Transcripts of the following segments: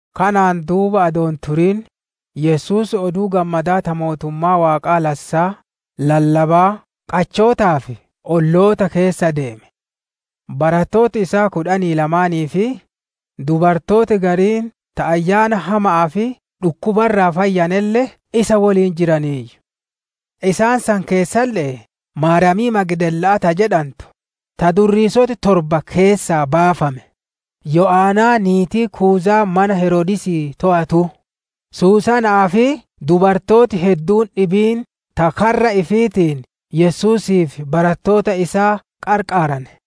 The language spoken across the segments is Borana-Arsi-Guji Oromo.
Kanaan duuba adoo hin turin, Yesuus Oduu Gammadaa ta mootummaa Waaqaa lassaa lallabaa qachootaa fi olloota keessa ideeme. Barattooti isaa kudhanii lamaanii, fi dubartooti gariin ta ayyaana hama'aa fi dhukkuba irraa fayyanelle isa woliin jiraniiyyu. Isaan san keessalle'ee Maariyaamii Magdalaa ta jedhantu, ta durriisoti torba keessaa baafame, Yo'anaa niitii Kuuzaa mana Heroodisii toowatuu, Susanaa fi dubartooti hedduun dhibiin ta karra ifiitiin Yesuusii fi barattoota isaa qarqaarane.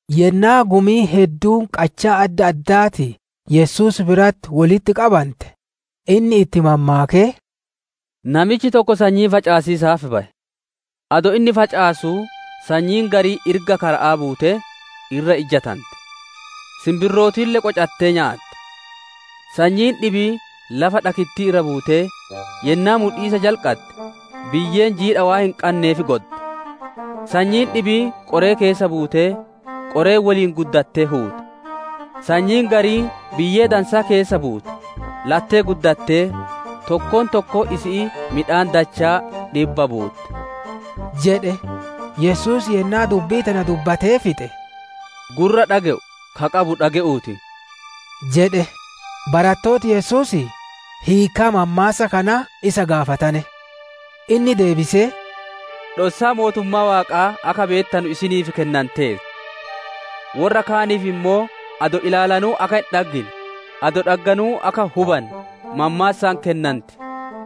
Yennaa gumiin hedduun qachaa adda addaatii Yesuus biratti wolitti qabante, inni itti mammaakee: «Namichi tokko sanyii facaasiisaaf baye. Adoo inni facaasuu sanyiin gariin irga kara'aa buutee, irra ijjatante; sinbirrootille qocattee nyaate. Sanyiin dhibiin lafa dhakittii irra buutee, yennaa mudhiisa jalqadde, biyyeen jiidha waan hin qanneef godde. Sanyiin dhibiin qoree keessa buutee, qoreen woliin guddattee huute. Sanyiin gariin biyyee dansaa keessa buute; lattee guddattee, tokkoon tokkoon isi'ii midhaan dachaa dhibba buutte» jedhe. Yesuus yennaa dubbii tana dubbatee fixe, «Gurra dhage'u ka qabu dhage'uuti!» jedhe. Barattooti Yesuusii hiikkaa mammaassa kanaa isa gaafatane. Inni deebisee, «Dhossaa mootummaa Waaqaa akka beettanu isiniif kennanteerti; worra kaaniif ammoo adoo ilaalanuu akka hin dhaggine, adoo dhagganuu akka hin hubanne, mammaassaan kennanti.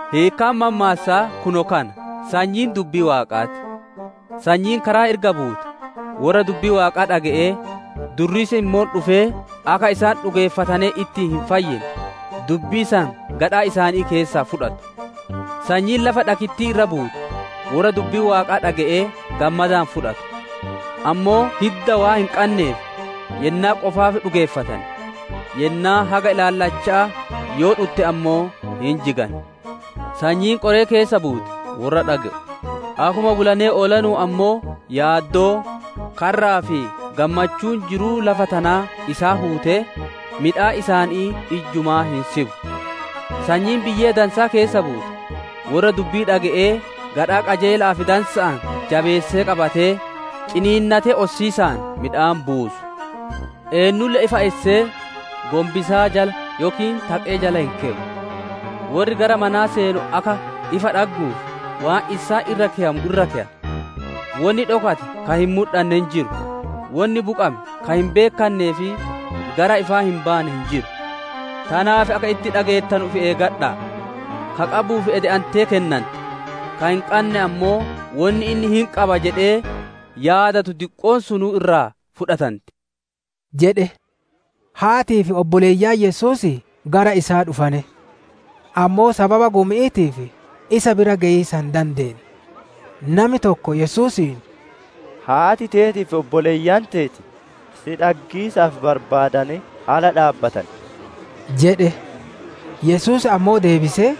«Hiikkaan mammaassaa kunoo kana: Sanyiin dubbii Waaqaa ti. Sanyiin karaa irga buute, worra dubbii Waaqaa dhage'ee, durriisi ammoo dhufee akka isaan dhugeeffatanee ittiin hin fayyine, dubbii san gadhaa isaanii keessaa fudhatu. Sanyiin lafa dhakittii irra buute, worra dubbii Waaqaa dhage'ee gammadaan fudhatu. Ammoo hidda waan hin qanneef, yennaa qofaaf dhugeeffatan; yennaan haga ilaalichaa yoo dhutte ammoo hin jigan. Sanyiin qoree keessa buute, worra dhage'u; akkuma bulanee oolanuun ammoo yaaddoon, karraa fi gammachuun jiruu lafa tanaa isaan huutee, midhaan isaanii ijjumaa hin sibu. Sanyiin biyyee dansaa keessa buute, worra dubbii dhage'ee gadhaa qajeela'aa fi dansa'aan jabeessee qabatee, ciniinnatee ossiisaan midhaan buusu. «Eennulle ifa issee, gonbisaa jala yookiin taqee jala hin keyu; worri gara manaa seenu akka ifa dhagguuf waan issaan irra keyamu irra keya. «Wonni dhokate ka hin mudhanne hin jiru, wonni buqame ka hin beekkannee fi gara ifaa hin baane hin jiru. Tanaaf akka itti dhageettanu ifi eeggadha'a! Ka qabuuf ede'antee kennanti, ka hin qanne ammoo wonni inni hin qaba jedhee yaadatu diqqoon sunuu irraa fudhatanti» jedhe. Haatii fi obboleeyyan Yesuusii gara isaa dhufane; ammoo sababa gumi'iitiif isa bira geyiisa hin dadeenne. Nami tokko Yesuusiin, «Haati teetii fi obboleeyyan teeti si dhaggiisaaf barbaadanee ala dhaabbatan» jedhe. Yesuus ammoo deebisee,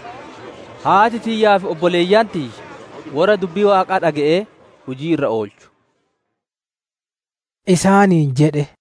«Haati tiyyaa fi obboleeyyan tiyya worra dubbii Waaqaa dhage'ee hujii irra oolchu» isaaniin jedhe.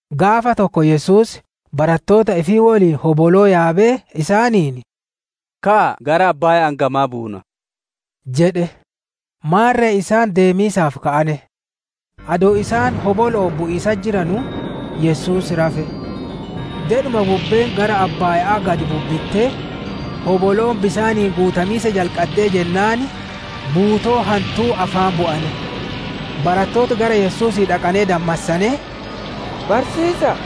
Gaafa tokko Yesuus barattoota ifii woliin hoboloo yaabee isaaniin, «Ka'aa gara abbaaya'aan gamaa buunaa» jedhe. Maarre isaan deemiisaaf ka'ane. Adoo isaan hobolo'oon bu'iisatti jiranuu, Yesuus rafe. Dedhuma bubbeen gara abbaaya'aa gad bubbittee, hoboloon bisaaniin guutamiisa jalqaddee jennaan, buutoo hantuu afaan bu'ane. Barattooti gara Yesuusii dhaqanee dammassanee, «Barsiisaa,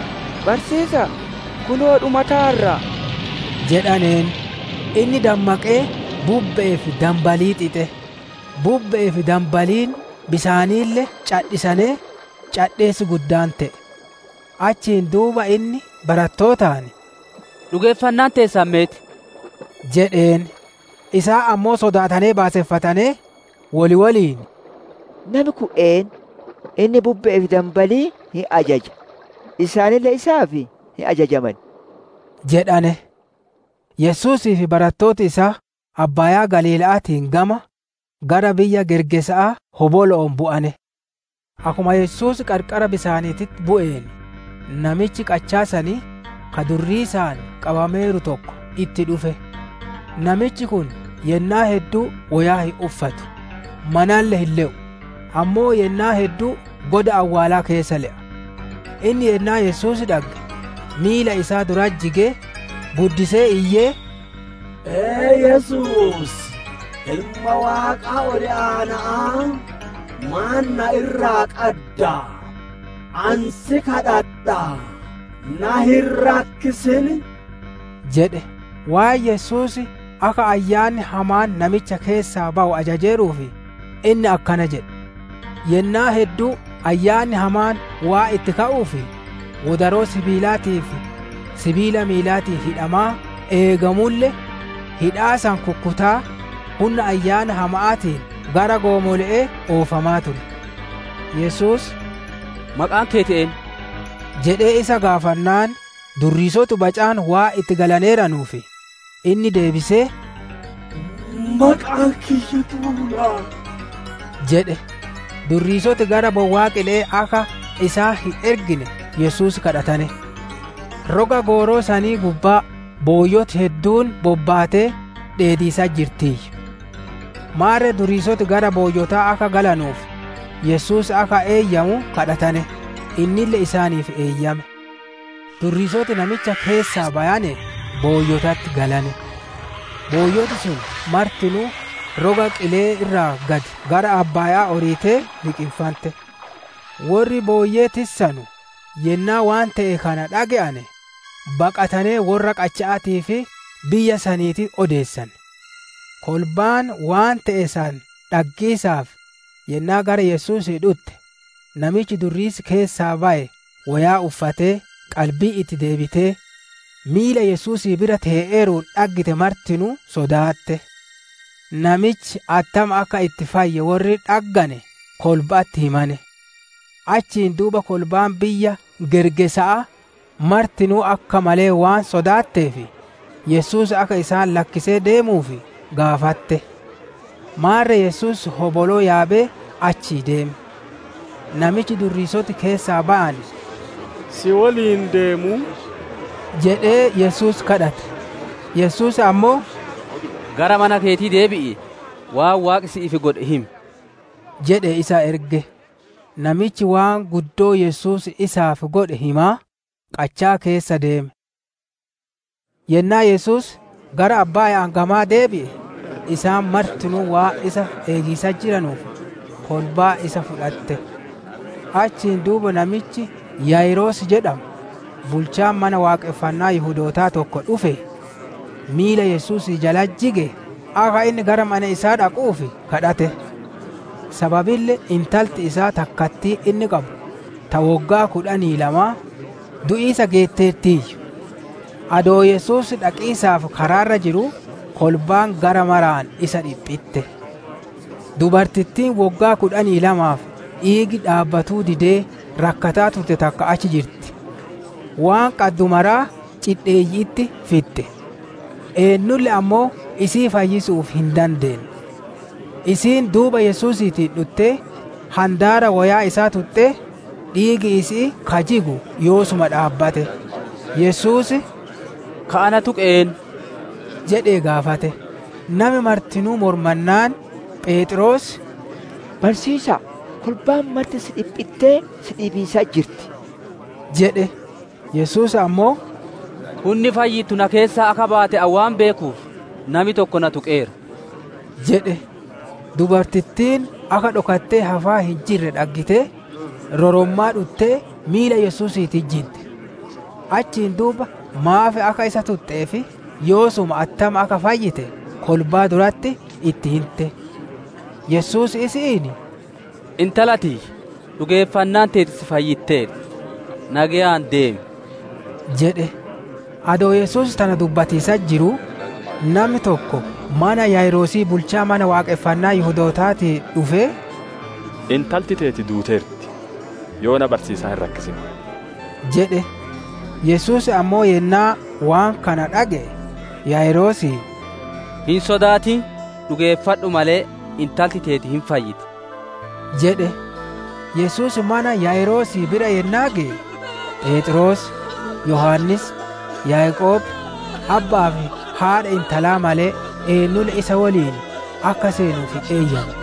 barsiisaa! Kunoo dhumataarra!» jedhaneen. Inni dammaqee bubbe'ee fi danbalii xixe; bubbe'ee fi danbaliin bisaaniille cadhisanee, cadheessi guddaan te'e. Achiin duuba inni barattootaan, «Dhugeeffannaan teessan meet?» jedheen. Isaan ammoo sodaatanee baaseffatanee, wol woliin, «Nami kun eennu? Inni bubbe'ee fi danbalii hin ajaja, isaanille isaaf hin ajajaman!» jedhane. Yesuusii fi barattooti isaa Abbaayaa Galiila'aatiin gama, gara biyya Gergeesa'aa hobolo'oon bu'ane. Akkuma Yesuus qarqara bisaaniititti bu'een, namichi qachaa sanii, ka durriisaan qabameeru tokko itti dhufe. Namichi kun yennaa hedduu woyaa hin uffatu, manalle hin le'u, ammoo yennaa hedduu goda awwaalaa keessa le'a. Inni yennaa Yesuus dhagge, miila isaa duratti jigee, guddisee iyyee, «Ee Yesuus, Ilma Waaqa Ol Aana'aa! Maan na irraa qadda? Ani si kadhadhaa, na hin rakkisin!» jedhe. Waan Yesuus akka ayyaanni hamaan namicha keessaa bayu ajajeeruuf, inni akkana jedhe. Yennaa hedduu ayyaanni hamaan waan itti ka'uuf, wodaroo sibiilaatii fi sibiila miilaatiin hidhamaa eegamulle, hidhaa san kukkutaa, hunna ayyaana hama'aatiin gara goomole'ee oofamaa ture. Yesuus, «Maqaan keeti eennu?» jedhee isa gaafannaan, durriisoti bacaan waan itti galaneeranuuf, inni deebisee, «Maqaan kiyya duula» jedhe. Durriisoti gara bowwaa qile'ee akka isaan hin ergine Yesuus kadhatane. Roga gooroo sanii gubbaa, booyyoti hedduun bobbaatee dheediisatti jirtiiyyu. Maarre durriisoti gara booyyotaa akka galanuuf, Yesuus akka eeyyamu kadhatane; innille isaaniif eeyyame. Durriisoti namicha keessaa bayanee booyyotatti galane. Booyyoti sun martinuu roga qile'ee irraa gad gara abbaaya'aa oriitee liqinfante. Worri booyyee tissanu yennaa waan te'e kana dhaggane, baqatanee worra qacha'aatii fi biyya saniititti odeessane. Kolbaan waan te'e san dhaggiisaaf, yennaa gara Yesuusii dhutte, namichi durriisi keessaa baye woyaa uffatee qalbiin itti deebitee, miila Yesuusii bira tee'eeruun dhaggite martinuu sodaatte. Namichi attam akka itti fayye worri dhaggane kolba'atti himane. Achiin duuba kolbaan biyya Gergeesa'aa martinuu akka malee waan sodaatteef, Yesuus akka isaan lakkisee deemuuf gaafatte. Maarre Yesuus hoboloo yaabee achii deeme. Namichi durriisoti keessaa bayane, «Si woliin deemuu?» jedhee Yesuus kadhate. Yesuus ammoo, «Gara mana keetii deebi'ii, waan Waaqi si'iif godhe himi» jedhee isa erge. Namichi waan guddoo Yesuus isaaf godhe himaa, qachaa keessa deeme. Yennaa Yesuus gara abbaaya'aan gamaa deebi'e, isaan martinuu waan isa eegiisatti jiranuuf, kolbaan isa fudhatte. Achiin duuba namichi Yaayiroos jedhamu, bulchaan mana Waaqonfannaa Yihudoota tokko dhufee, miila Yesuusii jalatti jigee akka inni gara mana isaa dhaquuf kadhate. Sababille intalti isaa takkattiin inni qabu, ta woggaa kudhanii lamaa, du'iisa geetteertiiyyu. Adoo Yesuus dhaqiisaaf karaa irra jiruu, kolbaan gara maraan isa dhiphitte. Dubartittiin woggaa kudhanii lamaaf dhiigi dhaabbatuu didee rakkataa turte takka achi jirti; waan qaddu maraa cidheeyyi'itti fixxe; eennulle ammoo isii fayyisu'uuf hin dandeenne. Isiin duuba Yesuusiitiin dhuttee handaara woyaa isaa tuxxee, dhiigi isi'ii ka jigu yoosuma dhaabbate. Yesuus, «Ka ana tuqe eennu?» jedhee gaafate. Nami martinuu mormannaan, Pheexroos, «Barsiisa'a, kolbaan marti si dhiphittee, si dhiibiisatti jirti» jedhe. Yesuus ammoo, «Hunni fayyittu na keessaa akka baate ani waan beekuuf, nami tokko na tuqeera» jedhe. Dubartittiin akka dhokattee hafaa hin jirre dhaggitee, rorommaa dhuttee miila Yesuusiititti jidde. Achiin duuba maaf akka isa tuxxee fi yoosuma attam akka fayyite kolbaa duratti itti hinte. Yesuus isi'iin, «Intala tiyya dhugeeffannaan teeti si fayyitteerti; nageyaan deemi» jedhe. Adoo Yesuus tana dubbatiisatti jiruu, nami tokko mana Yaayiroosii bulchaa Mana Waaqonfannaa Yihudootaatii dhufee, «Intalti teeti duuteerti. Yoona barsiisaa hin rakkisin» jedhe. Yesuus ammoo yennaa waan kana dhage'e Yaayiroosiin, «Hin sodaatin; dhugeeffadhu malee, intalti teeti hin fayyiti» jedhe. Yesuus mana Yaayiroosii bira yennaa geye, Pheexroos, Yohaannis, Yaaqoob, abba'aa fi haadha intalaa malee eennulle isa woliin akka seenuuf hin eeyyanne.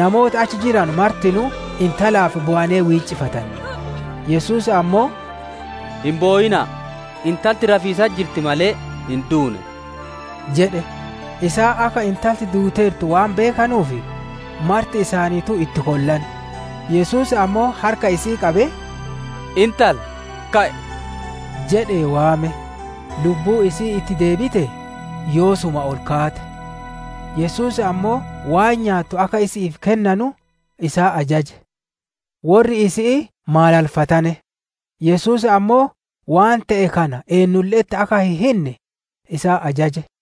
Namooti achi jiranu martinuu intalaaf bowanee wiiccifatane. Yesuus ammoo, «Hin bowina'a; intalti rafiisatti jirti malee, hin duune» jedhe. Isaan akka intalti duuteertu waan beekanuuf, marti isaaniituu itti kollane. Yesuus ammoo harka isi'ii qabee, «Intala, ka'i!» jedhee waame. Lubbuun isi'ii itti deebitee, yoosuma ol kaate; Yesuus ammoo waan nyaattu akka isi'iif kennanu isaan ajaje. Worri isi'ii maalalfatane; Yesuus ammoo waan te'e kana eennulle'etti akka hin hinne isaan ajaje.